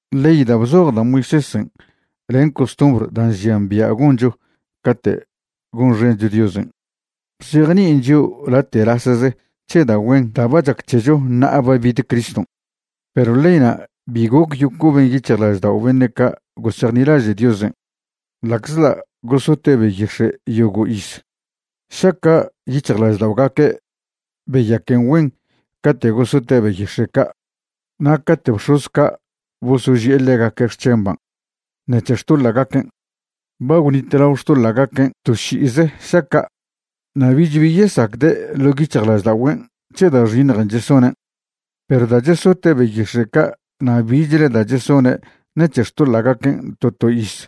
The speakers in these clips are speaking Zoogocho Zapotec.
Ley da' bzoj da' Moisésen' len costumbr da' nžian bia' goncho cate' gonxencho Diosen' bzejni'in chio' late'lasze c̱he da' güen da' ba chac c̱hecho ṉa'a ba bid Criston'. Perw leyna' bi goc yocoben yic̱hjlaždao' beṉe' ca' gosejnilaže' Diosen' ḻa'czḻa' gosote' beyix̱e' yogo' iz. Šaca' yic̱hjlažda'ogaque' beyaquen güen cate' gosote' beyix̱e' ca' na' cate' bx̱oz ca' bosoži'e ḻegaque' xc̱hemban' ṉec̱he xtoḻa'gaquen', ba gwnitlao xtoḻa'gaquen' to ši'ize šaca', na' bich bi yesacde' ḻo' yic̱hjlažda'ogüen' c̱he da' xiṉjen' chesonen'. Perw da' chesote' beyix̱e' ca' na' bichle da' chesone' ṉec̱he xtoḻa'gaquen' to to iz,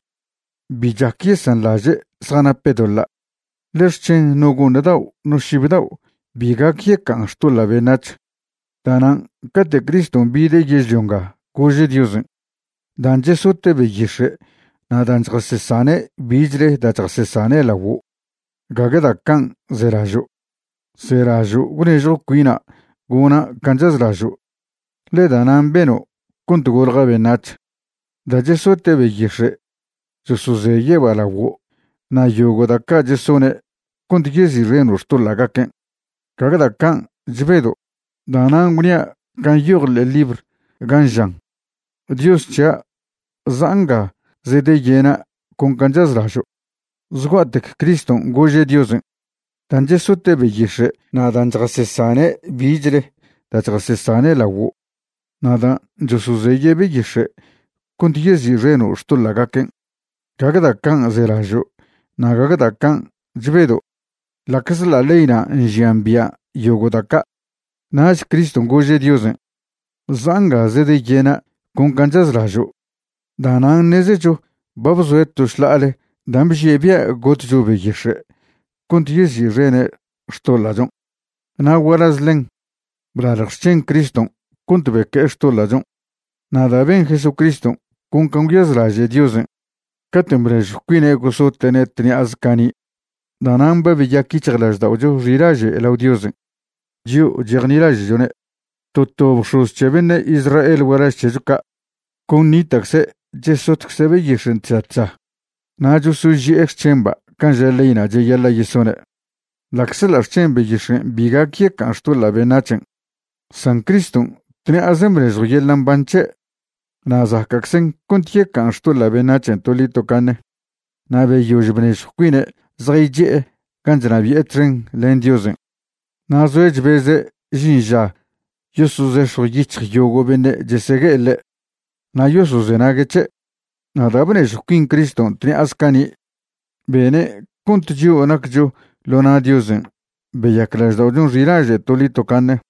bi chac yesanḻaže' zjanape' doḻa'. Ḻe xc̱hen no go'ṉ dao' no šib dao' bi gac yeca'an xtoḻa' beṉac̱h. Da'nan' cate' Criston' bide' yežlio nga gože' Diosen': Dan' chesote' beyix̱e' na' dan' chjasesane' bichle da' chjasesane' laguo', gague da' can' zelažo'. Zelažo' gwnežjw cuina' gona' can' chazlažo', ḻe da'nan' beno' cont golja beṉac̱h. Da' chesote' beyix̱e' chosozeye'ba' laguo' na' yogo' da' ca' chesone' cont yezi'xeno' xtoḻa'gaquen', gague da' can' chbedo'. Da'nan' gwnia' can' nyoj ḻe'e libr gan' žan: “Dios c̱hia', za'a nga zedeyena' con can' chazlažo'.” Zgua'tec Criston' gože' Diosen': “Dan' chesote' beyix̱e' na' dan' chjasesane' bichle da' chjasesane' laguo', na' dan' chosozeye' beyix̱e' cont yezi'xeno' xtoḻa'gaquen', gague da' can' zelažo' na' gague da' can' chbedo'”, ḻa'czḻa' leyna' nžian bia' yogo' da' ca'. Nach Criston' gože' Diosen': “Za'a nga zedeyena' con can' chazlažo'”. Da'nan' ṉezecho ba bzoe' to šḻa'ale dan' bžie' bia' gotcho beyix̱e' cont yezi'xene' xtoḻa'chon', na' gualaz ḻen, blalj xc̱hen Criston' cont beque'e xtoḻa'chon'. Na' da' ben Jesucriston' con can' gwyazlaže' Diosen' cate' bnežjw cuine' gosote'ne' tṉi'aze cani', da'nan' ba beyac yic̱hjlažda'ocho xilaže' lao Diosen', chio' chejnilaže'chone'. To to bx̱oz c̱he beṉe' Israel gualaž c̱hecho ca' con nita'cze' chesotcze' beyixen' tža tža na' chosoži'e xc̱hemba' can' ža leyna' cheyaḻa' yesone', ḻa'czḻa' xc̱hen beyix̱en' bi gac yeca'an xtoḻa' beṉac̱hen'. San Criston' tṉi'azen' bnežjw yeḻa' mban c̱he' na' zaca'czen cont yeca'an xtoḻa' beṉac̱hen' toḻi tocaṉe. Na' beyož bnežjw cuine' zjaychi'e gan' chnabi'e txen len Diosen'. Na' zoe' chbeze' žin ža yosozex̱jw yic̱hj yogo' beṉe' chesegue'e ḻe' na' yosozenague' c̱he'. Na' da' bnežjw cuin Criston' tṉi'aze cani', bene' cont chio' naccho ḻo na' Diosen' beyac lažda'ochon' xilaže' toḻi tocaṉe.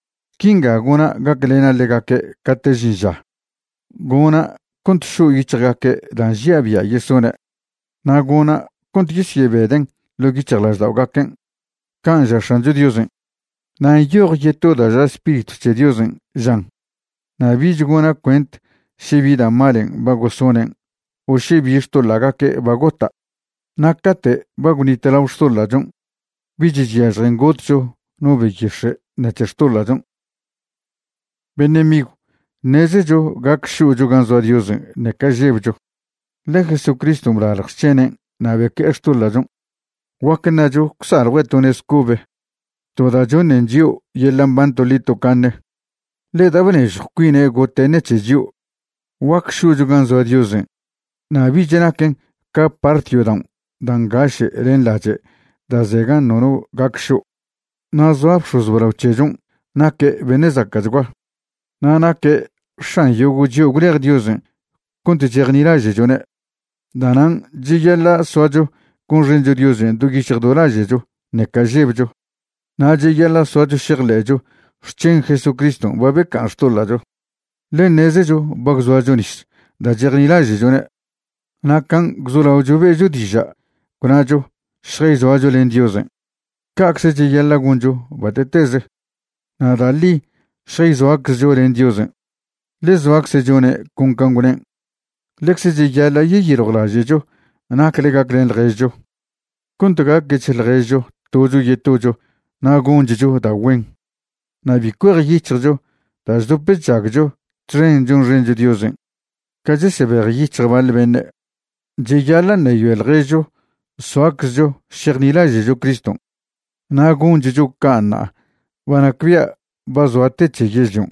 Quinga gona' gaclena' ḻegaque' cate' žin ža, gona' cont šo' yic̱hjgaque' da' nžia' bia' yesone', na' gona' cont yesyebeden' ḻo' yic̱hjlažda'ogaquen', can' ža X̱ancho Diosen'. Na' nyoj yeto da' ža Spiritw c̱he Diosen', žan: Na' bich gona' cuent še bi da' malen' ba gosonen' o še bi xtoḻa'gaque' ba gota'. Na' cate' ba gwnitlao xtoḻa'chon' bich chyažjen gotcho no beyix̱e' ṉec̱he xtoḻa'chon'. Beṉe' migw, ṉezecho gac šo'cho gan' zoa Diosen' ṉeca žebcho, ḻe Jesucriston' blalj xc̱henen' na' beque'e xtoḻa'chon'. Guac ṉacho gwsaljue' to nez cobe, to da' choṉen chio' yeḻa' mban toḻi tocaṉe, ḻe da' bnežjw cuine' gote' ṉec̱he chio', guac šo'cho gan' zoa Diosen' na' bich naquen ca part yodaon' da' ngaše' len lache' da' ze gan' nono gac šo'. Na' zoa bx̱oz blao c̱hechon' naque' beṉe' zaca'chgua, na' naque' X̱an yogo' chio' gwlej Diosen' cont chejnilaže'chone'. Da'nan' cheyaḻa' soacho gonxencho Diosen' do yic̱hj do laže'cho ṉeca žebcho, na' cheyaḻa' soacho šejḻe'cho xc̱hen Jesucriston' ba beca'an xtoḻa'cho, ḻe ṉezecho ba gwzoacho nis da' chejnilaže'chone'. Na' can' gwzolaocho be'cho diža' gwnacho šjayzoacho len Diosen', ca'cze cheyaḻa' goncho bate'teze, na' da' ḻi šjayzoaczcho len Diosen', ḻe zoacze' chone' con can' gwnen'. Ḻecze cheyaḻa' yeyiljwlaže'cho nacle gaclen ḻježcho cont gaquech ḻježcho tocho yetocho na' gonchcho da' güen. Na' bi cuejyic̱hjcho da' chdop chžagcho txen chonxencho Diosen' ca chesebejyic̱hj baḻ beṉe'. Cheyaḻa' ṉeyoe ḻježcho soaczcho šejnilaže'cho Criston', na' gonchcho ca' ṉa'a ba nacbia' ba zoa te c̱he yežlion'.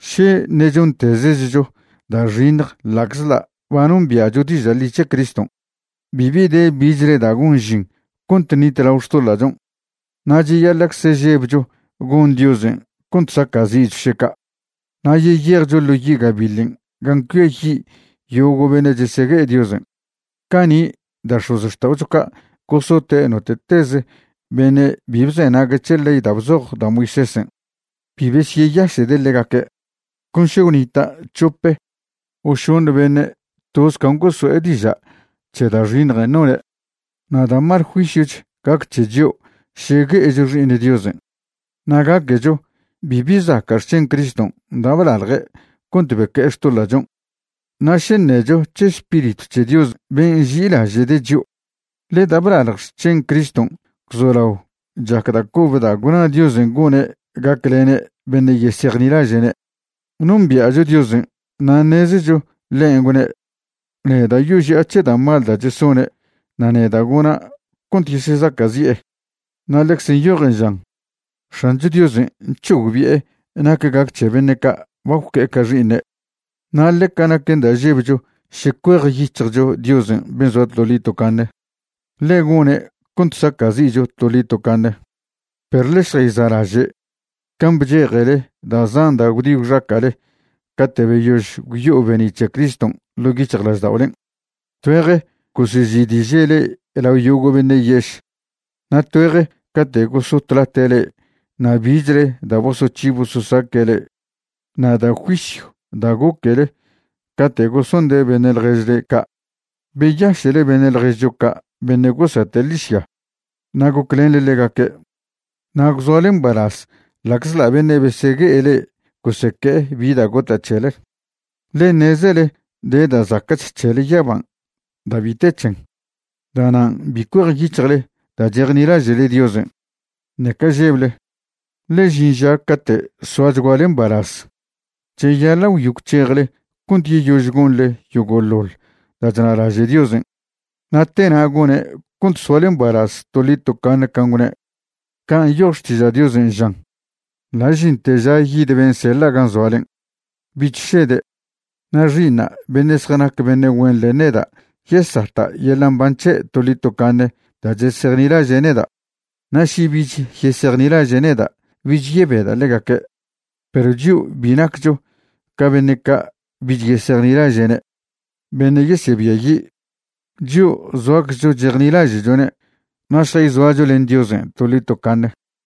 Še ṉe' chontezechcho da' xiṉj ḻa'czḻa' ba nombia'cho diža' ḻi c̱he Criston', bibi de bichle da' gon žin cont ṉitlao xtoḻa'chon'. Na' cheyaḻa'cze žebcho goṉ Diosen' cont saca'zi'cho še ca', na' yeyejcho ḻo yi' gabiḻen' gan' cuiayi' yogo' beṉe' chesegue'e Diosen'. Cani' da' x̱ozxta'ocho ca' gosote' note'teze beṉe' bi bzenague' c̱he ley da' bzoj da' Moisésen', bi besyeyaše'de' ḻegaque', con še gwnita' c̱hope o šoṉe beṉe' toz can' goso'e diža' c̱he da' xiṉjen' none'. Na' da' mal juisyoch gac c̱he chio' še gue'echo Xi'iṉ Diosen' na' gaquecho bibi zaca' xc̱hen Criston' da' blalje' cont beque'e xtoḻa'chon' na' še ṉecho c̱he Spiritw c̱he Dios ben' nži'ilaže'de' chio'. Ḻe da' blalj xc̱hen Criston' gwzolao chac da' cobe da' gwna Diosen' gone' gaclene' beṉe' yesejnilaže'ne'. Nombia'cho Diosen' na' ṉezecho ḻen' gwne': “Neda' yoži'a c̱he da' mal da' chesone' na' neda' gona' cont yesezaca'zi'e.” Na' ḻecze nyojen žan: “X̱ancho Diosen' c̱hogbi'e nac gac c̱he beṉe' ca' ba gwque'e ca xi'iṉe'.” Na' ḻeca naquen da' žebcho še cuejyic̱hjcho Diosen' ben' zoa toḻi tocaṉe, ḻe gone' cont saca'zi'cho toḻi tocaṉe. Perw ḻe šjayza'laže' can' bchejele da' zan da' gwdi gwxaca'le cate' beyož gwyo'o be'ni' c̱he Criston' ḻo' yic̱hjlažda'olen'. Tgüeje gosezi'diže' le'e lao yogo' beṉe' yež na' tgüeje cate' gosotlate' le'e na' bichle da' bosoc̱hi bososaque' le'e, na' da' juisyw da' goquele cate' gosonde' beṉe' ḻježle ca'. Beyaše'le beṉe' ḻježcho ca' beṉe' gosata' ḻižya na' goclenḻe ḻegaque', na' gwzoale mbalaz ḻa'czḻa' beṉe' besegue'e le'e goseque'e bi da' gota' c̱hele, ḻe ṉezele de da' zaca'ch c̱hele yaban' da' bi te c̱hen. Da'nan' bi cuejyic̱hjle da' chejnilaže'le Diosen', ṉeca žeble, ḻe žin ža cate' soachguale mbalaz. Cheyaḻa' gwyo gwc̱hejle cont yeyož gonḻe yogo'ḻoḻ da' chnalaže' Diosen', na' tena' gone' cont soale mbalaz toḻi tocaṉe can' gwne'. Can' nyoj Xtiža' Diosen', žan: Ḻa' žinte ža yid ben' seḻa' gan' zoalen', bich šede'. Na' xi'iṉa' beṉe' zjanac beṉe' güen len neda' yesata' yeḻa' mban c̱he' toḻi tocaṉe da' chesejnilaže' neda'. Na' še bich yesejnilaže' neda', bich yebeda' ḻegaque'. Perw chio' bi naccho ca beṉe' ca' bich yesejnilaže'ne', beṉe' yesebiayi'. Chio' zoaczcho chejnilaže'chone' na' šjayzoacho len Diosen' toḻi tocaṉe.